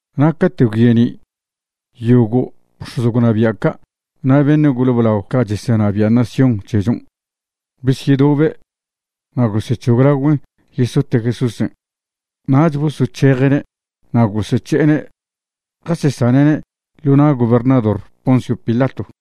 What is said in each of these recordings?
Na' cate' gwyeni', yogo' bx̱oz gwnabia' ca' na' beṉe' gole blao ca' chesenabia' nación c̱hechon' besyedobe' na' gosec̱hoglagüen' yesote' Jesúsen'. Nach bosoc̱heje'ne' na' gosec̱he'ene' jasesane'ne' ḻo na' gobernador Poncio Pilato.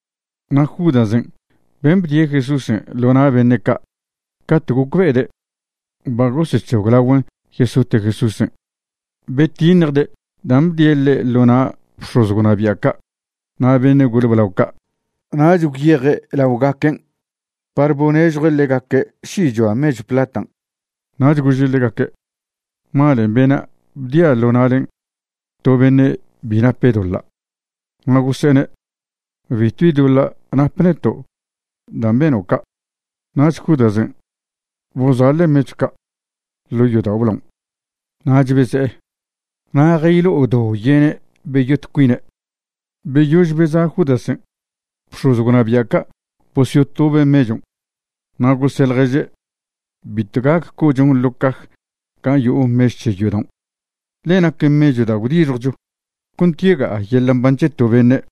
Na' Judasen' ben' bdie' Jesúsen' ḻo na' beṉe' ca', cate' gocbe'ede' ba gosec̱hoglagüen' yesote' Jesúsen', betiṉjde' dan' bdie' ḻe' ḻo na' bx̱oz gwnabia' ca' na' beṉe' gole blao ca'. Nach gwyeje' laogaquen' par bonežjue' ḻegaque' šichoa mechw platan'. Nach gože' ḻegaque': ―Malen' bena' bdia' ḻo na'len' to beṉe' bi nape' doḻa'. Na' gose'ene': ―Bitwbi doḻa' nap neto' dan' beno' ca'. Nach Judasen' bozaḻe' mechw ca' ḻo' yodao' blaon', nach beze'e na' jaylo'o do yene' beyot cuine'. Beyož beza' Judasen', bx̱oz gwnabia' ca' bosyotobe' mechon'. Na' gose' ḻježe': ―Bitw gac co'ochon ḻo' caj gan' yo'o mechw c̱he yodaon', ḻe naquen mechw dan' gwdixjwcho cont yega'a yeḻa' mban c̱he to beṉe'.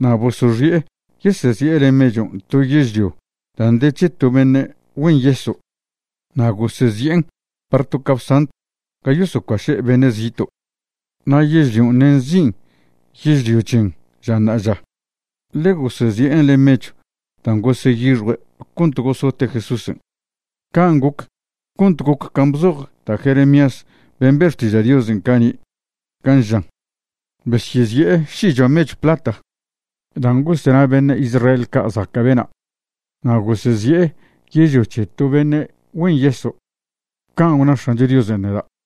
Na' bosoxi'e yesezi'e len mechon' to yežlio dan' de c̱he to beṉe' güen yeso'. Na' gosezi'en par to capsantw ga yosocuaše' beṉe' zito'. Na' yežlion' ṉe' nzin' Yežlio Chen ža ṉa'aža, ḻe gosezi'en len mechw dan' goseyixjue' cont gosote' Jesúsen'. Can' goc cont goc can' bzoj da' Jeremías ben' be' xtiža' Diosen' cani', gan' žan: “Besyezi'e šichoa mechw platan', dan' gosena beṉe' Israel zaca' bena'. Na' gosezi'e yežlio c̱he to beṉe' güen yeso', can' gwna X̱ancho Diosen' neda'.”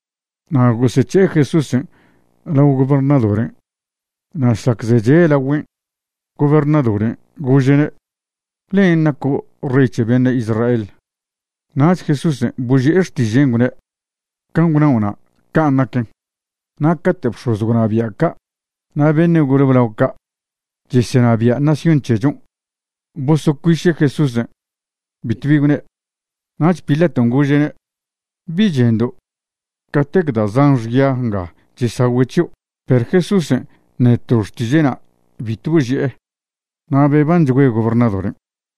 Na' gosec̱he'e Jesúsen' lao gobernadoren' na' šlac zeche' lagüen', gobernadoren' gože'ne': ―¿Len' naco' rey c̱he beṉe' Israel? Nach Jesúsen' boži'e xtižen', gwne': ―Can' gwnao'na', can' naquen. Na' cate' bx̱oz gwnabia' ca' na' beṉe' gole blao ca' chesenabia' nación c̱hechon' bosocuiše' Jesúsen', bitw bi gwne'. Nach Pilaton' gože'ne': ―¿Bi chendo' catec da' zan xya nga chesagüe' c̱hio'? Perw Jesúsen' ṉe to xtiže'na' bitw boži'e, na' bebanechgüe gobernadoren'.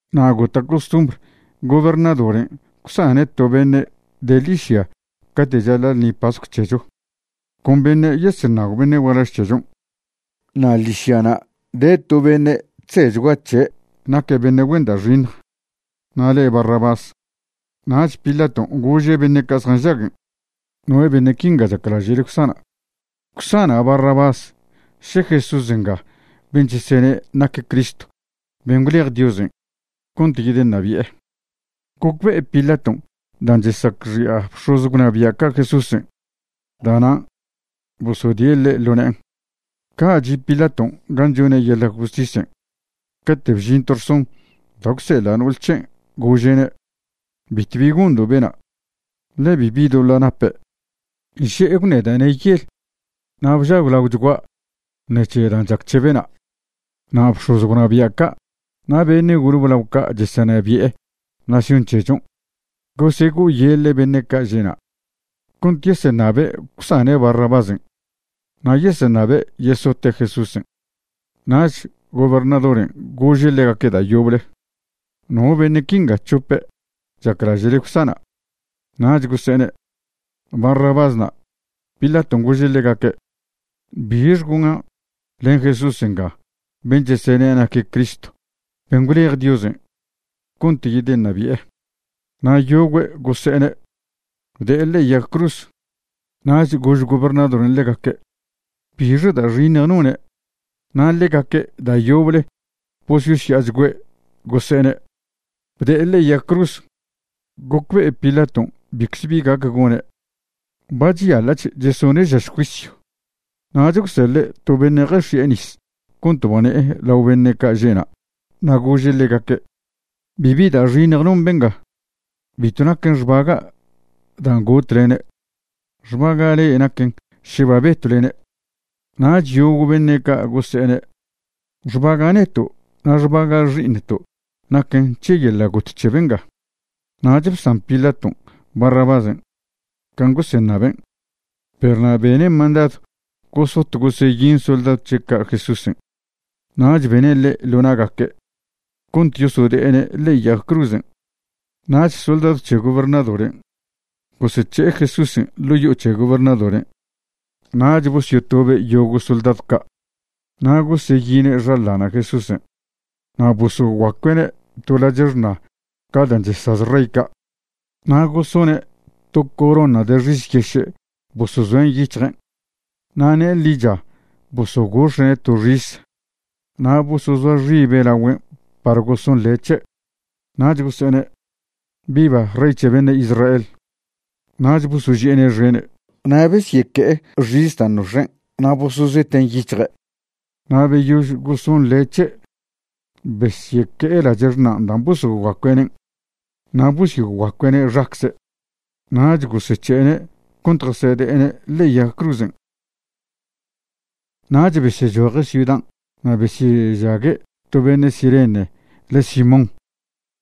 Na' gota' costumbr, gobernadoren' gwsane' to beṉe' de ḻižya cate' chaḻa' ḻṉi pascw c̱hecho, con beṉe' yeseṉab beṉe' gualaž c̱hechon'. Na' ḻižya na' de to beṉe' chzechgua c̱he' naque' beṉe' güen da' xiṉj, na' le' Barrabás. Nach Pilaton' gože' beṉe' ca' zjanžaguen': ―¿Noe' beṉe' quinga chaclaže'le gwsana'? ¿Gwsana' Barrabás še Jesús nga ben' chesene' naque' Cristo ben' gwlej Diosen' cont yedeṉabi'e? Gocbe'e Pilaton' dan' chesacxi'a bx̱oz gwnabia' ca' Jesúsen', da'nan' bosodie' ḻe' ḻo ne'en. Ca' chi' Pilaton' gan' chone' yeḻa' justisen', cate' bžin to rson da' gwseḻa' no'ol c̱hen', gože'ne': “Bitw bi gondo' bena', ḻe bibi doḻa' nape'. Nže'e gwṉeda'ne' yel na' bžaglaochgua' ṉec̱he dan' chac c̱he bena'.” Na' bx̱oz gwnabia' ca' na' beṉe' gole blao ca' chesenabi'e nación c̱hechon' gosego'oyeḻe' beṉe' ca' že'na' cont yeseṉabe' gwsane' Barrabásen' na' yeseṉabe' yesote' Jesúsen'. Nach gobernadoren' gože' ḻegaque' da' yoble: ―¿No beṉe' quinga c̱hope chaclaže'le gwsana'? Nach gose'ene': ―Barrabásna'. Pilaton' gože' ḻegaque': ―¿Bixe gona' len Jesús nga ben' chesene' naque' Cristo ben' gwlej Diosen' cont yedeṉabi'e? Na' yogüe' gose'ene': ―¡Bde'e ḻe'e yag cruz! Nach gož gobernadoren' ḻegaque': ―¿Bixe da' xiṉj nonen'? Na' ḻegaque' da' yoble bososya'achgüe' gose'ene': ―¡Bde'e ḻe'e yag cruz! Gocbe'e Pilaton' bicze bi gac gone'. Ba chyaḻa'ch chesone' žaš juisyw. Nach gwseḻe' to beṉe' jax̱i'e nis cont bone'e lao beṉe' ca' že'na' na' gože' ḻegaque': ―Bibi da' xiṉj non benga. Bitw naquen xbaga' dan' gotlene', xbaga' le'e naquen še ba betwlene'. Nach yogo' beṉe' ca' gose'ene': ―Xbaga' neto' na' xbaga' xi'iṉto' naquen c̱he yeḻa' got c̱he benga. Nach bsan Pilaton' Barrabásen' can' goseṉaben'. Perw na' bene' mandadw gosot goseyin soldadw c̱he' ca' Jesúsen', nach bene' ḻe' ḻo na'gaque' cont yosode'ene' ḻe'e yag cruzen'. Nach soldadw c̱he gobernadoren' gosec̱he'e Jesúsen' ḻo' yo'o c̱he gobernadoren', nach bosyotobe' yogo' soldadw ca'. Na' goseyiṉe' xaḻana' Jesúsen' na' bosoguacue'ne' to lache' xṉa ca dan' chesaz rey ca'. Na' gosone' to corona de xis yeše' bosozoen' yic̱hjen', na' ne'e ḻicha bosogox̱e'ne' to xis. Na' bosozoa xibe' lagüen' par gosonḻe' c̱he', nach gose'ene': ―¡Viva rey c̱he beṉe' Israel! Nach bosoži'ene' xene', na' besyeque'e xis dan' nox̱en' na' bosozeten' yic̱hje'. Na' beyož gosonḻe' c̱he', besyeque'e lache' xṉan' dan' bosoguacue'nen' na' bosyoguacue'ne' xacze'. Nach gosec̱he'ene' cont jasede'ene' ḻe'e yag cruzen'. Nach besechoje' ciudan' na' besyežague' to beṉe' Cirene le Simón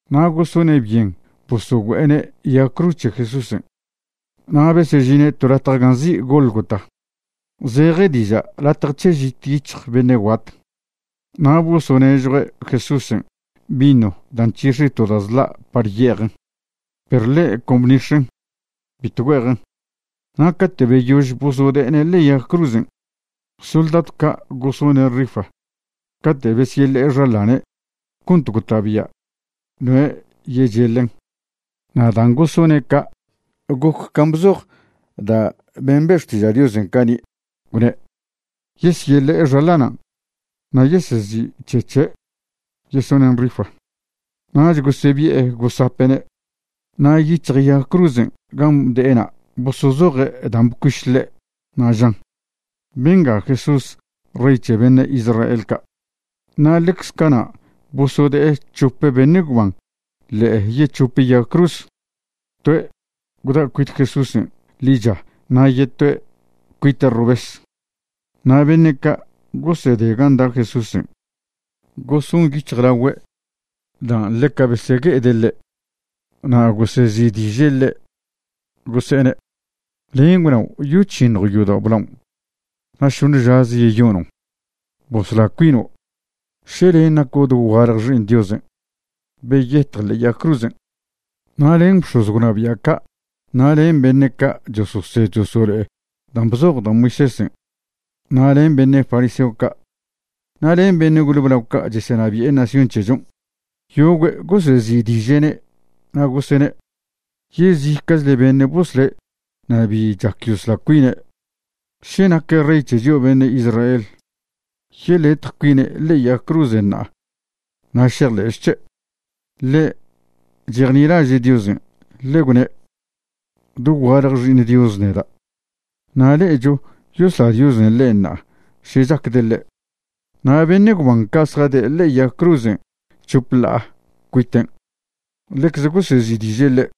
na' gosone' byen bosogüe'ene' yag cruz c̱he Jesúsen'. Na' besežine' to latje gan' nzi' Gólgota, zeje diža' latje c̱he žit yic̱hj beṉe' guat. Na' bosonežjue' Jesúsen' vino da' nc̱hix̱e to da' zḻa' par ye'ejen', perw ḻe' con bṉix̱en', bitw güe'ejen'. Na' cate' beyož bosode'ene' ḻe'e yag cruzen', soldadw ca' gosone' rifa cate' besyeḻe'e xaḻane' cont gota'bia' noe' yechelen'. Na' dan' gosone' ca' goc can' bzoj da' ben' be' xtiža' Diosen' cani', gwne': “Yesyeḻe'e xaḻanan' na' yesezi' c̱he c̱he', yesonen' rifa.” Nach gosebi'e gosape'ne'. Na' yic̱hj yag cruzen' gan' de'ena' bosozoje' dan' bcuiš ḻe', na' žan: “Benga Jesús rey c̱he beṉe' Israel ca'.” Na' ḻecze cana' bosode'e c̱hope beṉe' gwban ḻe'e yec̱hope yag cruz. Toe' gwda' cuit Jesúsen' ḻicha na' yetoe' cuite' robes. Na' beṉe' ca' gosede gan' da' Jesúsen' goson yic̱hjlagüe' dan' ḻeca besegue'ede' ḻe', na' gosezi'diže' ḻe', gose'ene': ―Len' gwnao' yoc̱hiṉjo' yodao' blaon' na' šoṉe žaze yeyonon', bosla cuino'. Še len' naco' doguale Xi'iṉ Diosen', beyetj ḻe'e yag cruzen'. Na' len bx̱oz gwnabia' ca' na' len beṉe' ca' chososed chosolo'e dan' bzoj da' Moisésen' na' len beṉe' fariseo ca', na' len beṉe' gole blao ca' chesenabi'e nación c̱hechon', yogüe' gosezi'diže'ne' na' gosene': ―¡Yezica'chle beṉe' bosle' na' bi chac yosla cuine'! Še naque' rey c̱he chio' beṉe' Israel, yeḻetj cuine' ḻe'e yag cruzen' ṉa'a na' šejḻe'cho c̱he'. Ḻe' chejnilaže' Diosen', ḻe gwne': “Dogualje Xi'iṉ Dios neda'.” ¡Na' le'echo yosla Diosen' ḻe' ṉa'a še chacde' ḻe'! Na' beṉe' gwban ca' zjada' ḻe'e yag cruzen' chop ḻa'a cuiten', ḻecze gosezi'diže' ḻe'.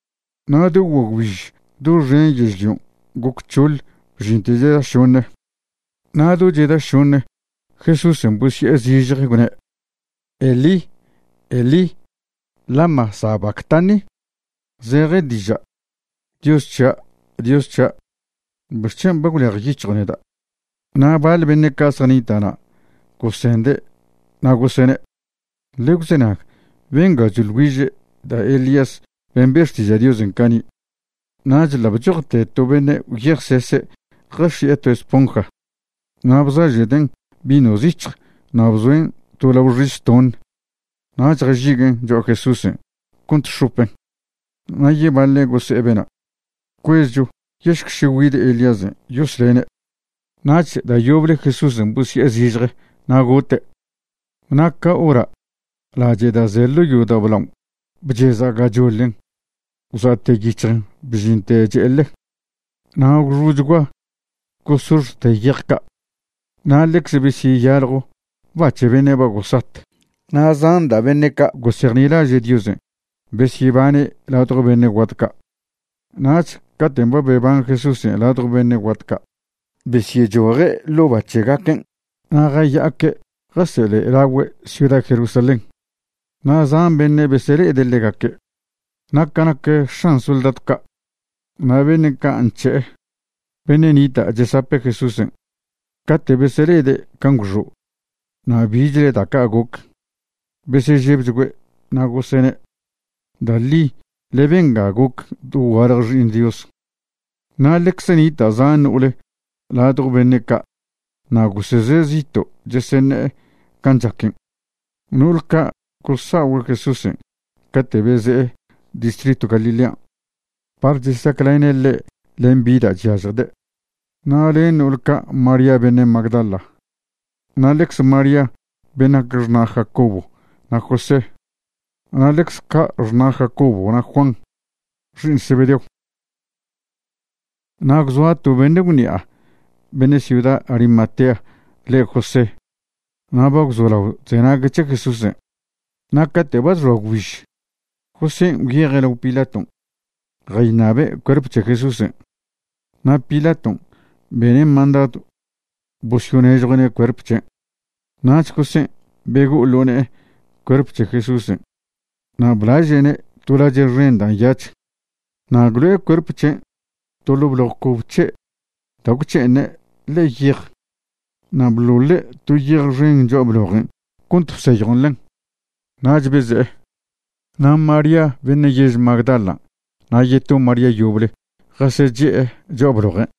Na' do guagwbiž doxen yežlion' goc c̱hoḻ bžinte cheda šoṉe. Na' do cheda šoṉe Jesúsen' bosye'e zižje gwne': ―Elí, Elí, ¿lama sabactani? (Zeje diža': Dios c̱hia', Dios c̱hia', ¿bixc̱hen' ba gwlejyic̱hjo' neda'?) Na' baḻ beṉe' ca' zjanita' na' gosende' na' gosene': ―Ḻe gwzenag, benga choḻ güiže' da' Elías ben' be' xtiža' Diosen' cani'. Nach ḻa' bchojte to beṉe' gwyejsese' jax̱i'e to esponja na' bzažeden' vino zic̱hj na' bzoen' to lao xis toṉe nach jažiguen' cho'a Jesúsen' cont xopen'. Na' yebaḻe' gose'e bena': ―Cuezcho, yešc še güide Elíasen' yosle'ne'. Nach da' yoble Jesúsen' bosye'e zižje na' gote'. Na' ca hora' lache' da' ze ḻo' yodao' blaon' bcheza' gachoḻen gwza'te yic̱hjen bžinte che'eḻe. Na' gwxo'chgua gosoxjte yej ca'. Na' ḻecze beseyaljo ba c̱he beṉe' ba gosat. Na' zan da' beṉe' ca' gosejnilaže' Diosen' besyebane' ladjo beṉe' guat ca'. Nach caten' ba beban Jesúsen' ladjo beṉe' guat ca', besyechoje' ḻo' ba c̱hegaquen' na' jaya'aque' jaselo'elagüe' ciuda Jerusalén. Na' zan beṉe' besele'ede' ḻegaque'. Na' ca nac x̱an soldadw ca' na' beṉe' ca' nc̱he'e, beṉe' nita' chesape' Jesúsen', cate' besele'ede' can' gwxo' na' bichle da' ca' goc, besežebchgüe', na' gosene': ―Da' ḻi ḻe benga goc dogualje Xi'iṉ Dios. Na' ḻecze nita' zan no'ole ladjo beṉe' ca' na' goseze' zito' cheseṉe'e can' chaquen'. No'ol ca' gosa'ogüe' Jesúsen' cate' beze'e distritw Galilean' par chesaclene' ḻe' len bi da' chyažjde'. Na' len no'ol ca' María beṉe' Magdala, na' ḻecze María ben' nac xṉa' Jacobo na' José, na' ḻecze ca' xṉa' Jacobo na' Juan, xi'iṉ Zebedeo. Na' gwzoa to beṉe' gwṉi'a beṉe' ciuda Arimatea le' José na' ba gwzolao chzenague' c̱he Jesúsen'. Na' cate' ba chxoa gwbiž Josén' gwyeje' lao Pilaton' jayṉabe' cuerp c̱he Jesúsen'. Na' Pilaton' bene' mandadw bosyonežjue'ne' cuerp c̱hen'. Nach Josén' bego'o ḻo ne'e cuerp c̱he Jesúsen' na' blaže'ne' to lache' xen da' nyach. Na' gwlo'e cuerp c̱hen' to ḻo' bloj cobe c̱he' da' gwc̱he'ene' ḻe'e yej. Na' bḻoḻe' to yej xen cho'a blojen' cont bseyjon ḻen. Nach beze'e. Na' María beṉe' yež Magdalan' na' yeto María yoble jasechi'e cho'a blojen'.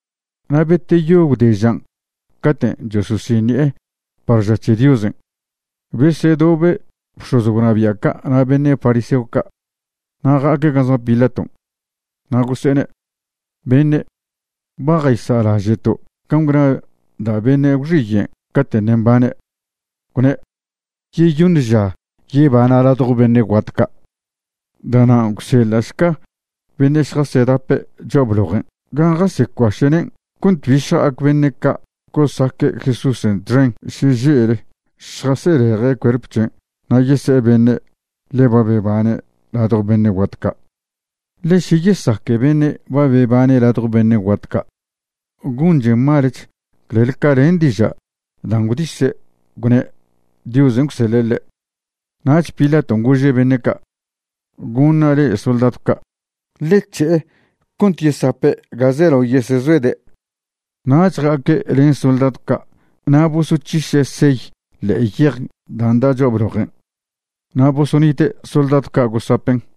Na' beteyo, gwde žan' caten' chososiṉi'e par ža c̱he Diosen', besedobe bx̱oz gwnabia' ca' na' beṉe' fariseo ca' na' ja'aque' gan' zoa Pilaton'. Na' gose'ene': ―Beṉe', ba jaysalaže'to' can' gwna da' beṉe' gwxiyen' cate' ṉe' mbane', gwne': “Yeyoṉ ža yebana' ladjo beṉe' guat ca'.” Da'nan' gwseḻa'šca beṉe' šjasedape' cho'a blojen' gan' jasecuaše'nen' cont bi šja'ac beṉe' ca' gosaque' Jesúsen' txen šeže'le šjasyeleje' cuerp c̱hen' na' yese'e beṉe' ḻe bebane' ladjo beṉe' guat ca'. Ḻe še yesaque beṉe' ba bebane' ladjo beṉe' guat ca', gonchen malech clel ca len diža' dan' gwdise' gwne' Diosen' gwseḻe' ḻe'. Nach Pilaton' gože' beṉe' ca': ―Goṉa' le'e soldadw ca'. Ḻe c̱he'e cont yesape' ga zelao yesezoede'. Nach ja'aque' len soldadw ca' na' bosoc̱hiše' sey ḻe'e yej dan' da' cho'a blojen', na' bosonite' soldadw ca' gosapen'.